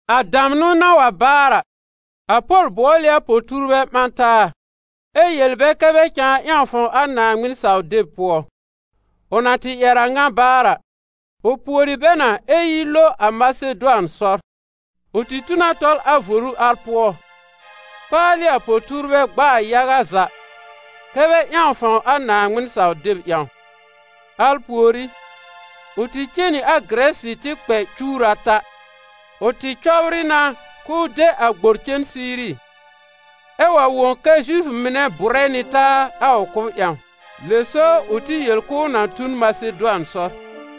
A damnʋ na wa baar a, a Pol bʋɔl ɩ a po-tuurbɛ ɓã taa ɛ yel bɛ kɛ́ bɛ cãa ƴãw fãw a Naaŋmɩn-saw-deb pʋɔ. Ʋ na tɩ ƴɛr a ŋa baar a, ʋ pùori bɛ na ɛ yi lo a Masedʋan sɔr. Ʋ tɩ tu na tɔl a voru al pʋɔ, kpaalɩ a po-tuurbɛ gb'aa yaga za kɛ́ bɛ ƴãw fãw a Naaŋmɩn-saw-deb ƴãw. Al pùorí, ʋ tɩ cen nɩ a Gɩrɛsɩ tɩ kpɛ cuwr ata. Ʋ tɩ cɔbrɩ na k'ʋʋ de a gbor cen Siiri, ɛ wa wõ kɛ Zifʋ mɩnɛ bʋrɛ nɩ taa a ʋ kʋ́b ƴãw, lɛ so ʋ tɩ yel k'ʋʋ na tu n Masedʋan sɔr.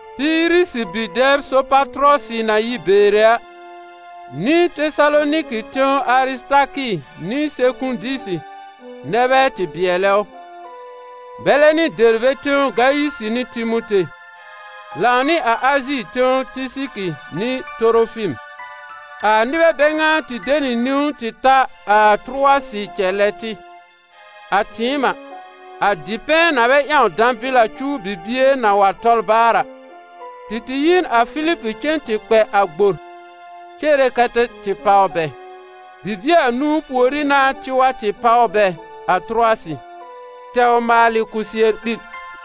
Piirisi bi-dɛb Sopatʋrɔsɩ na yi Beere a, nɩ Tesaloniki tẽw Arɩsɩtakɩ nɩ Sekũdisi nɛ bɛ tɩ bɩɛlɛ ʋ, bɛlɛ nɩ Dɛrbe tẽw Gayisɩ nɩ Timote, lãw nɩ Azi tẽw Tɩsɩkɩ nɩ Torofim. A nɩbɛ bɛ ŋa tɩ de nɩ niwn tɩ ta a Tʋrʋwasɩ cɛlɛ tɩ. A tɩɩm a, a dipɛ̃ na bɛ ƴãw dãbɩl a cuw bibie na wa tɔl baar a, tɩ tɩ yi n a Filib cen tɩ kpɛ a gbor cere kɛ́ tɩ tɩ páw bɛ. Bibie anũu pùorí n'a tɩ wa tɩ páw bɛ a Tʋrʋwasɩ, tɛw maalɩ kɔsɩɛr-ɓil.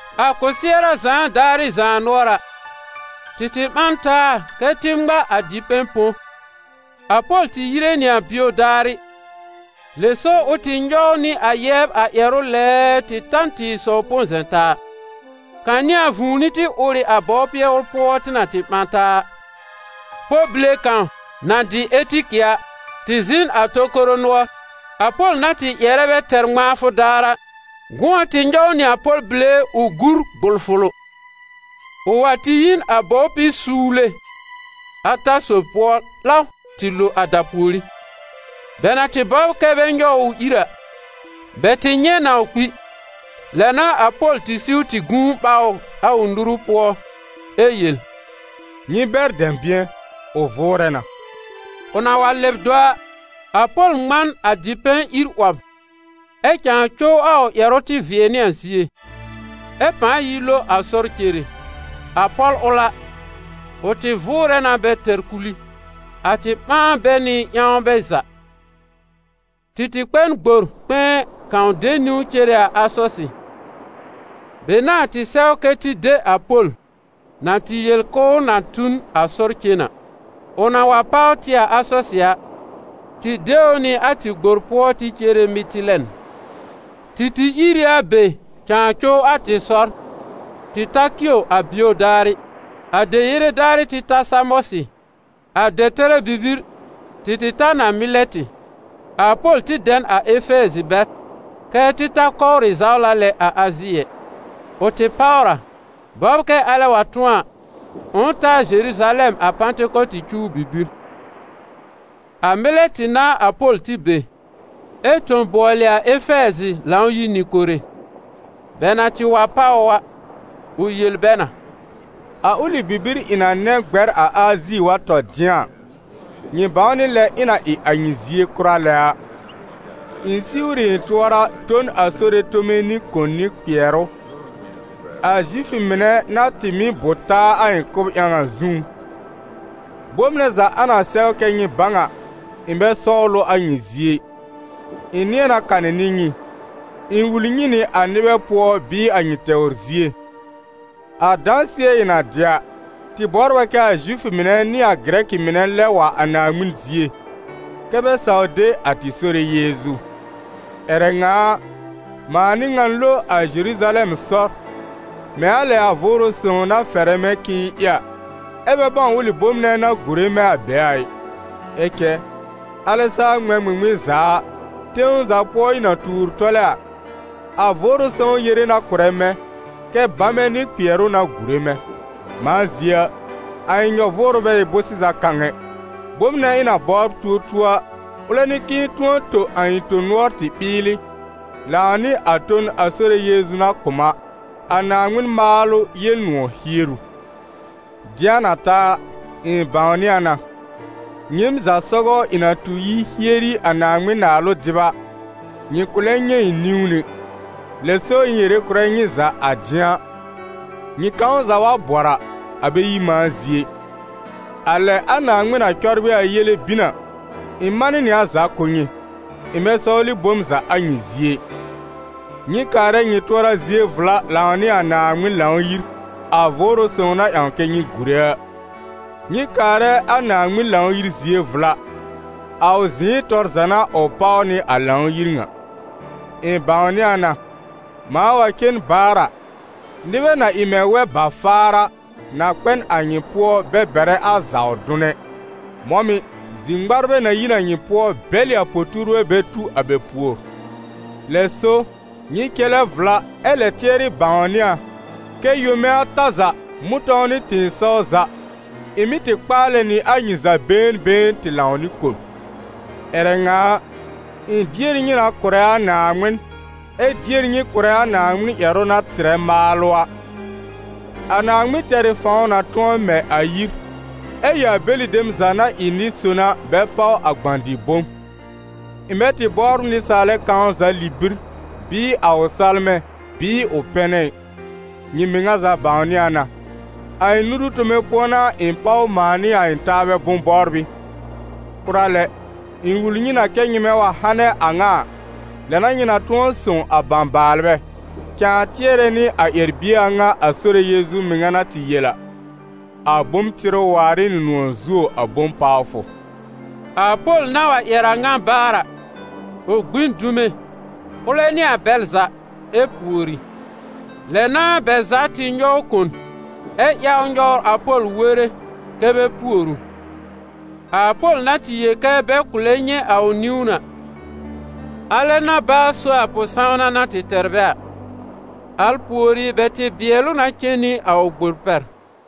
A kɔsɩɛra zãa daarɩ zaanʋɔra, tɩ tɩ ɓã n taa kɛ́ tɩ ŋma a dipɛ̃ põ. A Pol tɩ yire nɩ a bio daarɩ, lɛ so ʋ tɩ nyɔw nɩ a yɛbr a ƴɛrʋ lɛɛɛ tɩ ta n tɩ̃ɩsɔw põ-zɛ̃-taa. Kanɩ̃a vũuni tɩ ʋr ɩ a bɔwpɩɛ ʋl pʋɔ tɩ na tɩ ɓã taa a. Pɔl bile kãw, na dɩ Etikɩ a, tɩ zɩ̃ n a tokoro nʋɔr. A Pol na tɩ ƴɛrɛ bɛ tɛr ŋmãafʋ daar a, gʋ̃ɔ tɩ nyɔw nɩ a pɔl bile ʋl ʋ gur gbʋlfʋlʋ. Ʋ wa tɩ yi n a bɔwpɩ-suwle ata sob pʋɔ 'law tɩ lo a dapùorí. Bɛ na tɩ bɔbr kɛ́ bɛ nyɔw ʋ ʋ ìr a, bɛ tɩ nyɛ̃ na ʋ kpi. Lɛ n'a a Pol tɩ siw tɩ gũu ɓaw ʋ a ʋ nuru pʋɔ ɛ yel: «Nyɩ bɛr dɛ̃bɩ̃ɛ, ʋ vʋʋrɛ na.» Ʋ na wa lɛb do a, a Pol ŋmã n a dipɛ̃ ír 'wɔb, ɛ cãa cow a ʋ ƴɛrʋ tɩ vɩɛ nɩ a zie, ɛ pãa yi lo a sɔr cere. A pɔl ʋl a, ʋ tɩ vʋʋrɛ na bɛ tɛr kul ɩ. A tɩ ɓãa bɛ nɩ ƴãw bɛ za. Tɩ tɩ kpɛ n gbor kpɛ̃ɛ kãw de niwn cere Asɔsɩ. Be n'a a tɩ sɛw kɛ́ tɩ de a Pol, na tɩ yel kɛ ʋl na tu n a sɔr cen a. Ʋ na wa páw tɩ a Asɔsɩ a, tɩ de ʋ nɩ a tɩ gbor pʋɔ tɩ cere Mɩtɩlɛn. Tɩ tɩ ìr ɩ a be cãa cow a tɩ sɔr, tɩ ta Kio a bio daarɩ. A deyere daarɩ tɩ ta Samɔsɩ. A dɛtɛrɛ bibir, tɩ tɩ ta n a Mɩlɛtɩ. A Pol tɩ dɛ n a Efɛɛzɩ bɛr, kɛ́ tɩ ta kɔwrɩ zawla lɛ a Azi ɛ. Ʋ tɩ páwr a, bɔbr kɛ alɛ wa tʋ̃ɔ a, ʋ̃ʋ ta a Zeruzalɛm a Pãtɩkɔtɩ cuw bibir. A Mɩlɛtɩ n'a a Pol tɩ be, ɛ tõ bʋɔlɩ a Efɛɛzɩ Lãw-yir nɩ-kore. Bɛ na tɩ wa páw ʋ a, ʋ yel bɛ na: «A ʋlɩ bibir ɩ̃ na nɛ̃ gbɛr a Azi wa tɔ dɩ̃a a, nyɩ bãw nɩ lɛ ɩ̃ na ɩ a nyɩ zie kʋra lɛ a. Ɩ̃ siwr ɩ ɩ̃ tʋɔra tõ n a Sore tome nɩ kòn nɩ kpɩɛrʋ, a Zifʋ mɩnɛ na tɩ mɩ́ bʋ taa a ɩ̃ kʋ́b ƴãw a zũú. Bom nɛ za a na sɛw kɛ́ nyɩ bãw a, ɩ̃ bɛ sɔwl ʋ a nyɩ zie ɩ; ɩ̃ nɩ̃ɛ na kanɩ nɩ nyɩ, ɩ̃ wul nyɩ nɩ a nɩbɛ pʋɔ bɩɩ a nyɩ tɛwr zie. A dãsɩɛ ɩ̃ na dɩ a, tɩ bɔbr a kɛ a Zifʋ mɩnɛ nɩ a Gɩrɛkɩ mɩnɛ lɛb wa a Naaŋmɩn zie, kɛ́ bɛ saw de a tɩ Sore Yeezu. Ƴɛrɛ ŋa a, mãa n'ɩ ŋan lo a Zeruzalɛm sɔr, mɛ̃ a lɛ a Vʋʋrʋ Sõw na fɛrɛ mɛ̃ k'ɩ̃ɩ ɩ a, ɛ́ bɛ bãw ʋlɩ bom nɛ na gùre mɛ̃ a be a ɩ. Ɛ cɛ alɛ saa ŋmɛ̃ ŋmɩŋmɩn za a, tẽw za pʋɔ ɩ̃ na tuur tɔlɛ a, a Vʋʋrʋ Sõw yere na kʋ̀rɛ mɛ̃, kɛ́ bamɛ nɩ kpɩɛrʋ n'a gùre mɛ̃. Mãa zie a, a ɩ̃ nyɔ-vʋʋrʋ bɛ ɩ bʋ̃-sɩza kãw ɛ. Bom nɛ ɩ̃ na bɔbr tuo tuo a, ʋlɛ n'ɩ k'ɩ̃ɩ tʋ̃ɔ tõ a ɩ̃ tõ-nʋɔr tɩ ɓɩɩlɩ, lãw nɩ a ton a Sore Yeezu na kʋ̀ m a: a Naaŋmɩn maalʋ Yel-nʋ̃ɔ̀ hieru.» «Dɩ̃a na ta a, ɩ̃ bãwnɩ a na, nyɩɩm za sɔgɔ ɩ̃ na tu yi hieri a Naaŋmɩn-Naalʋ dɩb a, nyɩ kʋ̃ lɛ nyɛ̃ ɩ̃ niwn ɛ. Lɛ so ɩ̃ yere kʋ̀rɛ nyɩ za a dɩ̃a, nyɩ kãw za wa bɔr a, a bɛ yi mãa zie ɩ. A lɛ a Naaŋmɩn na cɔbrɩ a yele bin a, ɩ̃ manɩ nɩ a za kʋ̀ nyɩ, ɩ̃ bɛ sɔwlɩ bom za a nyɩ zie ɩ. Nyɩ kaarɛ nyɩ tʋɔra zie vla lãw nɩ a Naaŋmɩn Lãw-yir, a Vʋʋrʋ Sõw na ƴãw kɛ nyɩ gùre a. Nyɩ kaarɛ a Naaŋmɩn Lãw-yir zie vla. A ʋ zɩ̃ɩ tɔr za n'a ʋ páw nɩ a Lãw-yir ŋa. Ɩ̃ bãwnɩ a na, mãa wa cen baar a, nɩbɛ na ɩ mɛ̃ wɛ-ba-faar a, na kpɛ n a nyɩ pʋɔ bɛ bɛrɛ a zaw dʋn ɛ. Mɔ̃ mɩ̀, zi-ŋmarbɛ na yi n a nyɩ pʋɔ bɛlɩ a po-tuurbɛ bɛ tu a bɛ pùor. Lɛ so, nyɩ cɛlɛ vla ɛ lɛ tɩɛrɩ bãwnɩ a kɛ yome ata za, mʋ̃tɔ̃w nɩ tɩ̃ɩsɔw za, ɩ̃ mɩ́ tɩ kpaalɛ nɩ a nyɩ za been been tɩ lãw nɩ kon. Ƴɛrɛ ŋa a, ɩ̃ dier nyɩ na kʋ̀rɛ a Naaŋmɩn, ɛ dier nyɩ kʋ̀rɛ a Naaŋmɩn ƴɛrʋ na tɩrɛ maalʋ a. A Naaŋmɩn tɛr ɩ fãw na tʋ̃ɔ mɛ a yir, ɛ ɩ a bɛlɩ dem za na ɩ nɩ-son a bɛ páw a gbã-dɩ-bom. Ɩ̃ bɛ tɩ bɔbr nɩsaalɛ kãw za libir, bɩɩ a ʋ salmɛ, bɩɩ ʋ pɛnɛ ɩ. Nyɩ mɩŋa za bãwnɩ a na, a ɩ̃ nuru tome pʋɔ n'a ɩ̃ páw mãa nɩ a ɩ̃ taabɛ bʋ̃-bɔbrɩ. Kʋra lɛ, ɩ̃ wul nyɩ na kɛ́ nyɩmɛ wa hanɛ a ŋa a, lɛ n'a nyɩ na tʋ̃ɔ sõw a bãbaalbɛ, cãa tɩɛrɛ nɩ a ƴɛr-bie a ŋa a Sore Yeezu mɩŋa na tɩ yel a: ‹A bom tɩrʋ waar ɩ nɩ nʋ̃ɔ̀ zuo a bom pawfʋ.›» A Pol na wa ƴɛr a a ŋa baar a, ʋ gbi n dume, ʋlɛ nɩ a bɛl za, ɛ pùori. Lɛ n'a bɛ za tɩ nyɔw kon, ɛ ƴawr nyɔwr a Pol were kɛ́ bɛ pùor ʋ. A Pol na tɩ yel kɛ bɛ kʋ̃ lɛ nyɛ̃ a ʋ niwn a, alɛ n'a baa so a pʋ-sãwna na tɩ tɛr bɛ a. Al pùorí bɛ tɩ bɩɛl ʋ na cen nɩ a ʋ gbor pɛr.